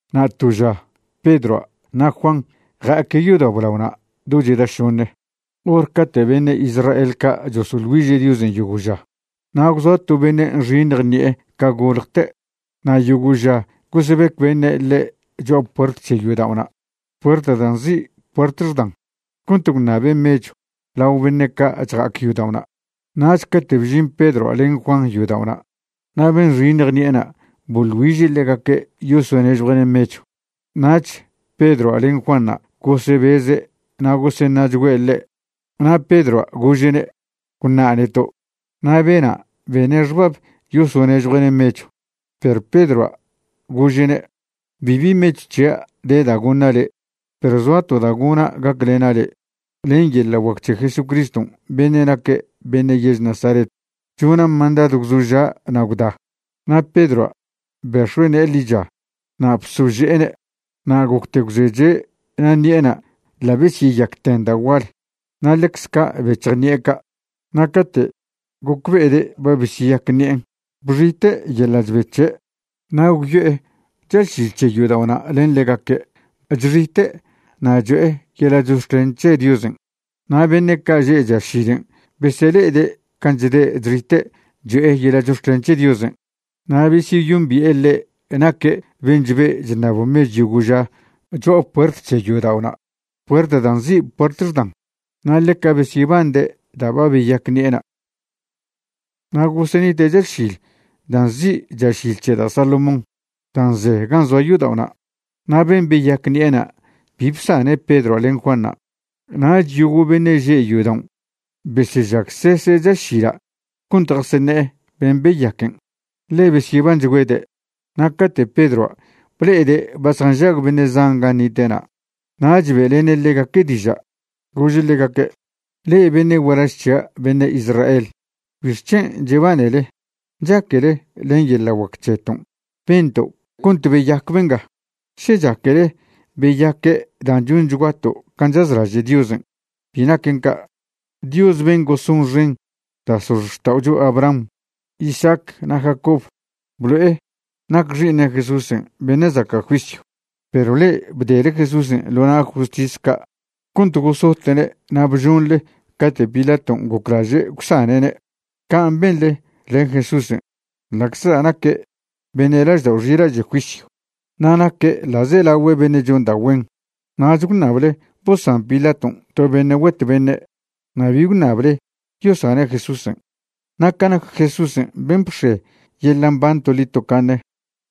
Na' to ža Pedroa' na' Juan ja'aque' yodao' blaona' do cheda šoṉe, hor cate' beṉe' Israel ca' chosoḻ güiže' Diosen' yogo' ža. Na' gwzoa to beṉe' nxiṉj ṉi'e ca goljte' na' yogo' ža gosebec beṉe' ḻe' cho'a puert c̱he yodao'na', puert dan' nzi' Puert Xdan, cont gwṉabe' mechw lao beṉe' ca' chja'ac yodao'na'. Nach cate' bžin Pedroa' len Juan yodao'na' na' ben' nxiṉj ṉi'ena' boḻ güiže' ḻegaque' yosonežjue'ne' mechw. Nach Pedroa' len Juanṉa' gosebeze' na' goseṉa'chgüe' ḻe' na' Pedroa' gože'ne': ―Gwṉa' neto'. Na' bena' bene' xbab yosonežjue'ne' mechw. Perw Pedroa' gože'ne': ―Bibi mechw c̱hia' de da' goṉa' le', perw zoa to da' gona' gaclena' le': len yeḻa' guac c̱he Jesucriston' beṉe' naque' beṉe' yež Nazaret, chona' mandadw gwzoža' na' gwda. Na' Pedroa' bex̱oe' ne'e ḻicha na' bsože'ene', na' gocte gwzeche' na' ṉi'ena' ḻa' besyeyacten da' gual na' ḻecz ca' bec̱hj ṉi'e ca'. Na' cate' gocbe'ede' ba besyeyac ṉi'en', bxite' yeḻa' chbe c̱he'. Na' gwyo'e chašil c̱he yodao'na' len ḻegaque' chxite' na' cho'e yeḻa' chox̱clen c̱he Diosen'. Na' beṉe' ca' že' chašilen' besele'ede' can' chde' chxite' cho'e yeḻa' chox̱clen c̱he Diosen'. Na' besyeyombi'e ḻe' naque' ben' chbe' chṉab mechw yogo' ža cho'a puert c̱he yodao'na', puert dan' nzi' Puert Xdan, na' ḻeca besyebande' da' ba beyac ṉi'ena'. Na' gosenite' chašil da' nzi' Chašil c̱he da' Salomón dan' ze gan' zoa' yodao'na'. Na' ben' beyac ṉi'ena' bi bsane' Pedroa' len Juanṉa'. Nach yogo' beṉe' že' yodaon' besežagsese' chašila' cont jaseṉe'e ben' beyaquen', ḻe besyebanchgüede'. Na' cate' Pedroa' ble'ede' ba zjanžag beṉe' zan gan' nite'na' nach be'lene' ḻegaque' diža', gože' ḻegaque': ―Le'e beṉe' gualaž c̱hia' beṉe' Israel, ¿bixc̱hen' chebanele? ¿Chaquele len yeḻa' guac c̱heton' bento' cont beyac benga? ¿Še chaquele beyaque' dan' chonchguato' can' chazlaže' Diosen'? Bi naquen ca'. Dios ben' gosonxen da' x̱ozxta'ocho Abraham, Isaac na' Jacob, blo'e nac Xi'iṉe' Jesúsen' beṉe' zaca' juisyw. Perw le'e bdele Jesúsen' ḻo na' justis ca' cont gosote'ne' na' bžonḻe cate' Pilaton' goclaže' gwsane'ne'. Can' benḻe len Jesúsen' ḻa'czla' naque' beṉe' laždao' xilaže' juisyw na' naque' ḻa'zelagüe beṉe' chon da' güen. Nach gwṉable bosan Pilaton' to beṉe' güetw beṉe' na' bi gwṉable yosane' Jesúsen'. Na' ca nac Jesúsen' ben' bx̱e yeḻa' mban toḻi tocaṉe,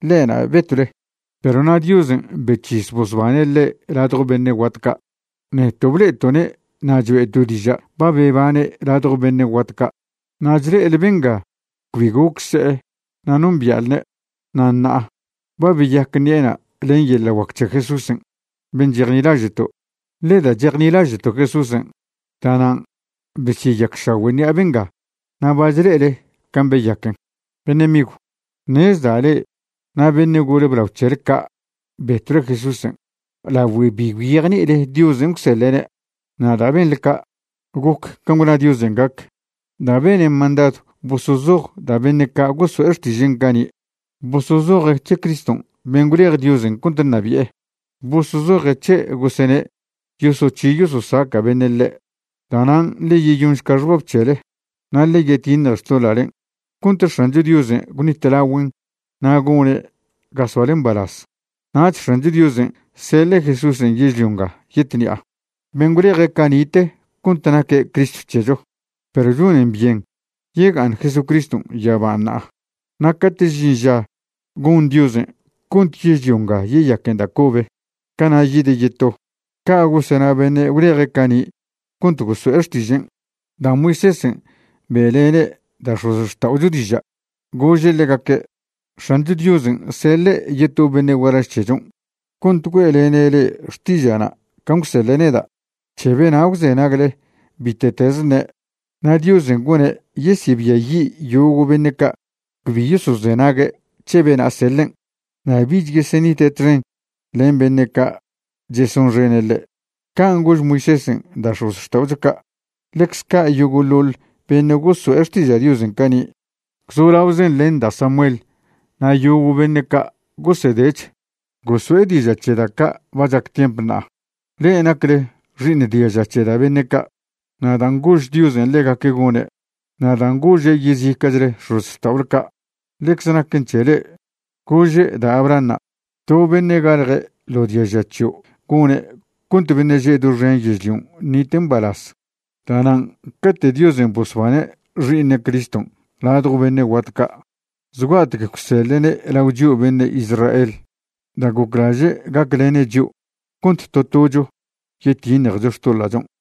ḻe'na' betwle, perw na' Diosen' bec̱his bosbane' ḻe' ladjo beṉe' guat ca'. Neto' ble'eto'ne' na' choe'to' diža' ba bebane' ladjo beṉe' guat ca'. Na' chle'ele benga cbi goc se'e na' nombia'lne', na' ṉa'a ba beyac ṉi'ena' len yeḻa' guac c̱he Jesúsen' ben' chejnilaže'to'. Ḻe da' chejnilaže'to' Jesúsen', da'nan' besyeyacšagüe' ṉi'a benga na' ba chle'ele can' beyaquen'. ’Beṉe' migw, ṉezda' le'e na' beṉe' gole blao c̱hele ca' betwle Jesúsen' lagüe bi gwyejni'ile Diosen' gwseḻe'ne'. Na' da' benḻe ca', goc can' gwna Diosen' gac, da' bene' mandadw bosozoj da' beṉe' ca' goso'e xtižen' cani', bosozoje' c̱he Criston' ben' gwlej Diosen' cont ṉabi'e. Bosozoje' c̱he' gosene' yosoc̱hi yososaca' beṉe' ḻe'. Da'nan' ḻe yeyonšca xbab c̱hele na' ḻe yetiṉje xtoḻa'len' cont X̱ancho Diosen' gwṉitlagüen' na' gone' ga soale mbalaz. Nach X̱ancho Diosen' seḻe' Jesúsen' yežlio nga yetṉi'a, ben' gwleje' cani'te cont naque' Cristo c̱hecho. Perw chonen byen yega'aṉ Jesucriston' yaban' ṉa'a, na' cate' žin ža gon Diosen' cont yežlio nga yeyaquen da' cobe, cana' yide' yeto. Ca' gosena beṉe' gwleje' cani' cont goso'e xtižen'. Da' Moisésen' be'lene' da' x̱ozxta'ocho diža', gože' ḻegaque': “X̱ancho Diosen' seḻe' yeto beṉe' gualaž c̱hechon' cont güe'lene' le'e xtiže'na' can' gwseḻe' neda'. C̱he bena' gwzenagle bite'tez ṉe'. Na' Diosen' gone' yesebiayi' yogo' beṉe' ca' cbi yosozenague' c̱he bena' seḻen', na' bich yesenite' txen len beṉe' ca' chesonxene' ḻe'.” Can' gož Moisésen' da' x̱ozxta'ocho ca'. ’Ḻecz ca' yogo'ḻoḻ beṉe' goso'e xtiža' Diosen' cani', gwzolaozen len da' Samuel na' yogo' beṉe' ca' gosedech, goso'e diža' c̱he da' ca' ba chac tiemp ṉa'a. Le'e nacle xi'iṉ diaža c̱he da' beṉe' ca', na' dan' gož Diosen' ḻegaque' gone', na' dan' gože' yezica'chle x̱ozxta'ole ca', ḻecz naquen c̱he le'e. Gože' da' Abrahanṉa': “To beṉe' galje ḻo diaža c̱hio' gone' cont beṉe' že' doxen yežlion' ṉite' mbalaz.” Da'nan' cate' Diosen' bosbane' Xi'iṉe' Criston' ladjo beṉe' guat ca', zgua'tec gwseḻe'ne' lao chio' beṉe' Israel da' goclaže' gaclene' chio' cont to tocho yetiṉjecho xtoḻa'chon'.